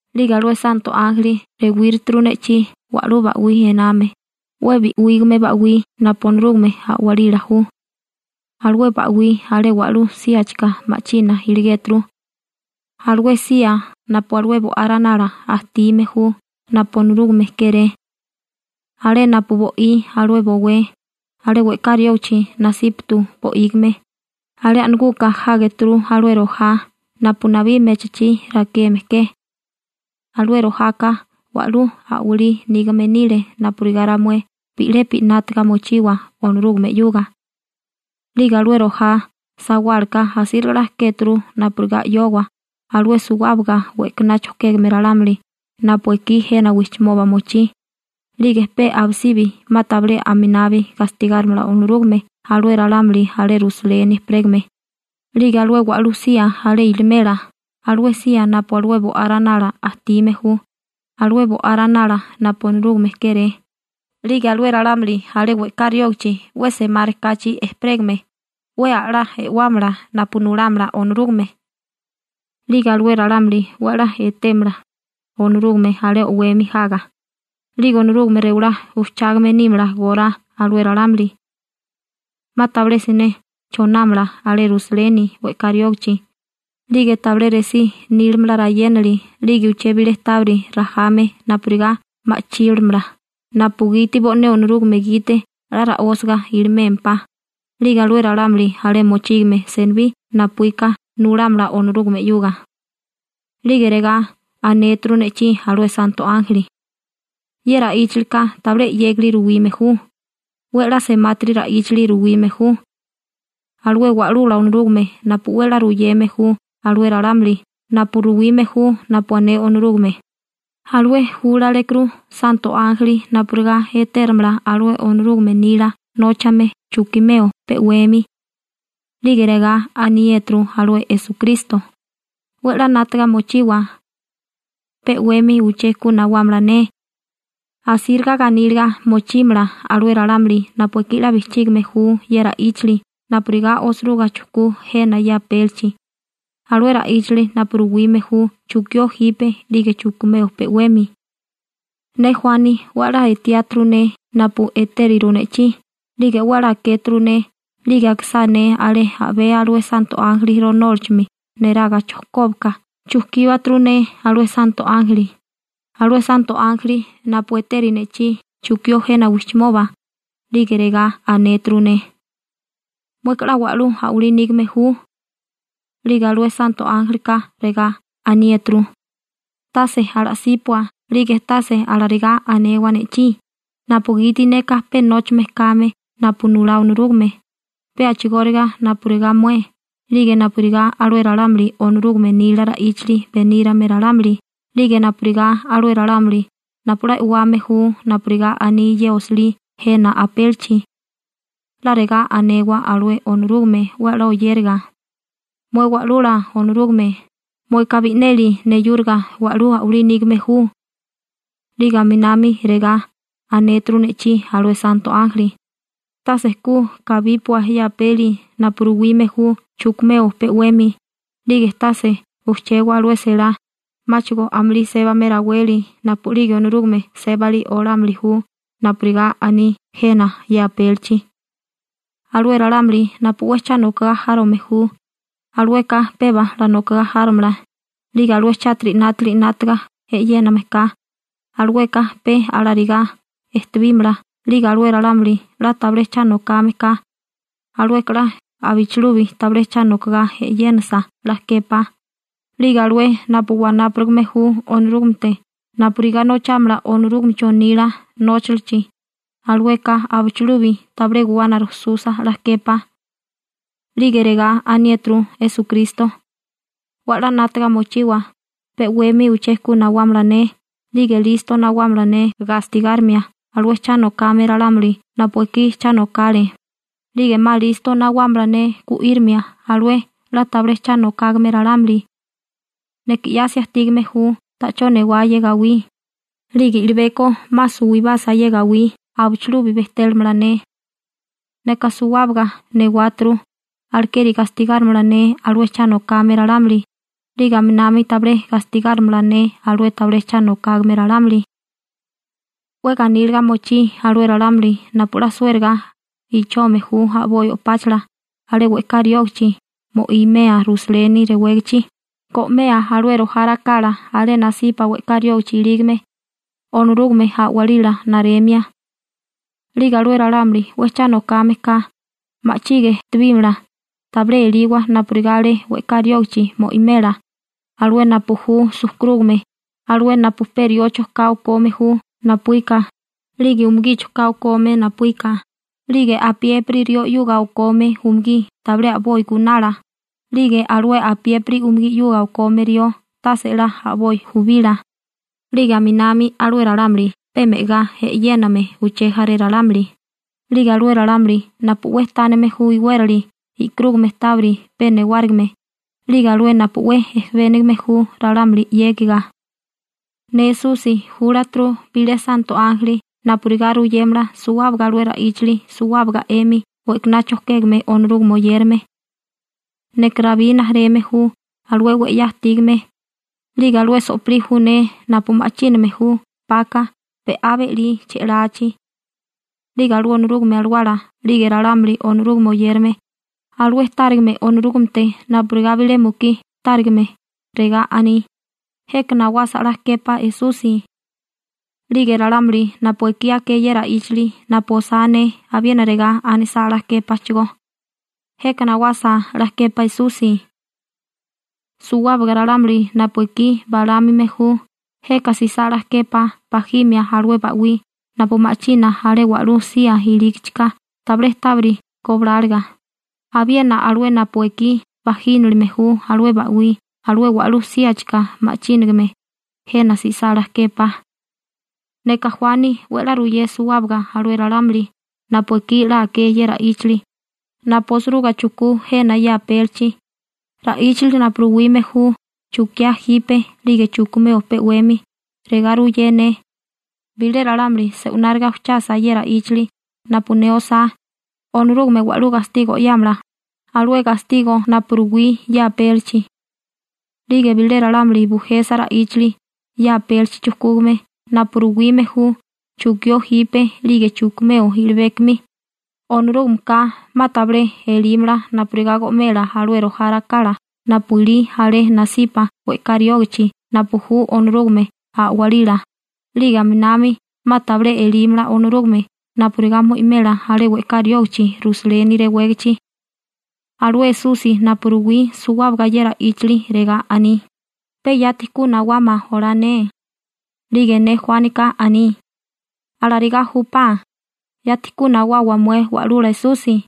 'Lige alué santo ánjeli rewíruturu ne'chí wa'lú ba'wí ename, 'we bi'wígame ba'wí napu Onorúgame a'walila ju. Alué ba'wí alé wa'lú síachika ma'china iligéturu, alué sía napu alué Bo'á Ranala ajtime ju napu Onorúgame kéré. Alé napu bo'í alué bowé, alé we'ká riógachi nasípatu bo'ígime, alé a'naguka jágeturu alué rojá napu nabí mechachí rakeme ke. Alué rojaka wa'lú a'walí nígame nile napurigá ramué bi'lepi 'nátaga mochiwa Onorúgame 'yuga. 'Lige alué rojá sawálaka asíriga 'la kéturu napurigá 'yowa alué suwábaga we'kaná chojkégame ralámuli napu ekí jena wijchimoba mochí, 'lige pe abisibi 'ma tabilé aminabi gastigárimala Onorúgame alué ralámuli alé Rusaleni ejperégame, 'lige alué wa'lú sía alé ilimela, alué sía napu alué Bo'á Ranala ajtime ju, alué Bo'á Ranala napu Onorúgame kéré, 'lige alué ralámuli alé we'ká riógichi 'we semárikáchi ejperégame 'we 'la e'wámala napu nulámala Onorúgame, 'lige alué ralámuli 'we 'la etémala Onorúgame alé o'wemi jaga, 'lige Onorúgame rewalá ujchágame nímala gorá alué ralámuli. 'Ma tabilé siné chonámala alé Rusaleni we'ká riógichi, 'lige tabilé resí nílamala rayénali 'lige uché bilé tábiri rajame napurigá ma'chílamala napugiti bo'né Onorúgame gite 'la ra'ósiga ilimémpá, 'lige alué ralámuli alé mochígame senibí napuíka nulámala Onorúgame 'yuga. 'Lige regá anéturu ne'chí alué santo ánjeli: ―Ye ra'íchalika tabilé 'yégali ruwime ju, 'we 'la semátiri ra'íchali ruwime ju. Alué Wa'lula Onorúgame napu 'we 'la ruyeme ju alué ralámuli napu ruwime ju napu ané Onorúgame, alué júlalekuru santo ánjeli napurigá etérimala alué Onorúgame nila nóchame chukimeo pe 'wemi. 'Lige regá aniéturu alué Esukristo: ―'We 'la 'nátaga mochiwa. Pe 'wemi uché ku nawámala ne. Asíriga ganíliga mochímala alué ralámuli napu ekí 'la bijchígime ju ye ra'íchali napurigá osiruga chujkú jena ye apélichi, alué ra'íchali napu ruwime ju chukió jipe 'lige chukimeo pe 'wemi. Ne Juani 'we 'la etiáturu ne napu etériru ne'chí 'lige 'we 'la akéturu ne 'lige akisá ne alé a'bé alué santo ánjeli ronólachimi neraga chojkóbaka chujkíbaturu ne alué santo ánjeli, alué santo ánjeli napu etériri ne'chí chukió jena wijchimoba, 'lige regá anéturu ne: ―Mueka 'la wa'lú a'walí nígame ju. 'Lige alué santo ánjelika regá aniéturu: ―Tase ala'sípua 'lige tase alarigá anewa ne'chí, napugiti neka pe nóchame kame napu nulá Onorúgame, pe a'chigóriga napurigá mué, 'lige napurigá alué ralámuli Onorúgame nila ra'íchali benírame ralámuli, 'lige napurigá alué ralámuli napu 'la e'wame ju napurigá aní ye osilí jena apélichi. 'La regá anewa alué Onorúgame 'we 'la oyériga: ‹‹Mué Wa'lula Onorúgame, mueka bi'neli neyúriga wa'lú a'walí nígame ju.›› 'Lige aminami regá anéturu ne'chí alué santo ánjeli: ―Tase ku kabípua ye apeli napu ruwime ju chukimeo pe 'wemi, 'lige tase ujchewa alué selá, 'máchigo amulí sébame raweli napu'lige Onorúgame sébali olámili ju napurigá aní jena ye apélichi. Alué ralámuli napu 'we cha nokagá járome ju, alueka peba 'la nokogá járomala, 'lige alué chátiri 'nátili 'nátaga e'yéname ka, alueka pe alarigá ejtebímala, 'lige alué ralámuli 'la tabilé cha nokame ka, alueka 'la abichilubi tabilé cha nokagá e'yénasa 'la képá, 'lige alué napu wanápurigame ju Onorúgamete napurigá nochámala Onorúgamecho nila nóchalichi, alueka abichilubi tabilé guwana rujsusa 'la képá. 'Lige regá aniéturu Esukristo: ―'We 'la 'nátaga mochiwa, pe 'wemi uché ku nawámala ne 'lige listo nawámala ne gastigárimia alué cha nokame ralámuli napu ekí cha nokale, 'lige 'ma listo nawámala ne gu'írimia alué 'la tabilé cha nokágame ralámuli. Neka 'yasi ajtígame ju ta'chó newá ye gawí, 'lige i'libeko 'ma suwibasa ye gawí abichilubi bejtélamala ne. Neka suwábaga newáturu, alekeri gastigárimala ne alué cha nokame ralámuli 'lige aminami tabilé gastigárimala ne alué tabilé cha nokágame ralámuli. › 'We ganíliga mochí alué ralámuli napu 'la suériga ichome ju a'boi o'páchala alé we'ká riógichi mo'imea Rusaleni rewégichi, go'mea alué rojá rakala alé nasipa we'ká riógichi ilígame, Onorúgame a'walila naremia. 'Lige alué ralámuli 'we cha nokame ka ma'chige ejtebímala, tabilé eliwa napurigá alé we'ká riógachi mo'imela, alué napu ju sujkurúgame, alué napu pe riocho ka okome ju napuíka, 'lige umugicho ka okome napuíka, 'lige apiépiri rió 'yuga okome umugí tabilé a'boi gunala 'lige alué apiépiri umugí 'yuga okome rió tase 'la a'boi jubila, 'lige aminami alué ralámuli pe me'agá e'yéname uché jaré ralámuli, 'lige alué ralámuli napu 'we tánime ju iwérali e'karúgame tábiri pe newárigime, 'lige alué napu 'we ejebénigame ju ralámuli 'yégiga. › Ne Esusi júlaturu bilé santo ánjeli napurigá ruyémala suwábaga alué ra'íchali suwábaga 'emi we'kaná chojkégame Onorúgame oyérame. Neka Rabí rijimala ju, alué 'we 'ya ajtígame, 'lige alué so'pilí ju ne napu ma'chíname ju 'paka be'á be'lí che'lachi. 'Lige alué Onorúgame Alawala 'lige ralámuli Onorúgame oyérame, alué tárigame Onorúgamete napurigá bilé mukí tárigame, regá aní: ―Jeka nawasa 'la képá Esusi. 'Lige ralámuli napu ekí aké ye ra'íchali napu osá ne abiena regá anisá 'la képáchigó: ―Jeka nawasa 'la képá Esusi. Suwábaga ralámuli napu ekí balámime ju, jeka jsisá 'la képá bajimia alué ba'wí napu ma'china alé wa'lú sía ilígichika tabilé tábiri gobláliga, abiena alué napu ekí bajínilime ju alué ba'wí alé wa'lú síachika ma'chínigame, jeka jsisá 'la képá. Neka Juani 'we 'la ruyé suwábaga alué ralámuli napu ekí 'la aké ye ra'íchali napu osiruga chujkú jena ye apélichi, ra'íchali napu ruwime ju chukiá jipe 'lige chukimeo pe 'wemi, regá ruyé ne: Bilé ralámuli se'wináriga ujchasa ye ra'íchali napu ne osá, Onorúgame wa'lú gastigo 'yámala, alué gastigo napu ruwí ye apélichi. 'Lige bilé ralámuli bujesa ra'íchali ye apélichi chujkúgame napu ruwime ju chukió jipe 'lige chukimeo i'libékimi, Onorúgameka 'ma tabilé elímala napurigá go'mela alué rojá rakala napu ilí alé nasipa we'ká riógichi napu ju Onorúgame a'walila, 'lige aminami 'ma tabilé elímala Onorúgame napurigá mo'imela alé we'ká riógichi Rusaleni rewégichi. Alué Esusi napu ruwí suwábaga ye ra'íchali, regá aní: ―Pe yati ku nawama olá ne. 'Lige ne Juánika aní: ―¡Alarigá júpá, yati ku nawawa mué Wa'lula Esusi!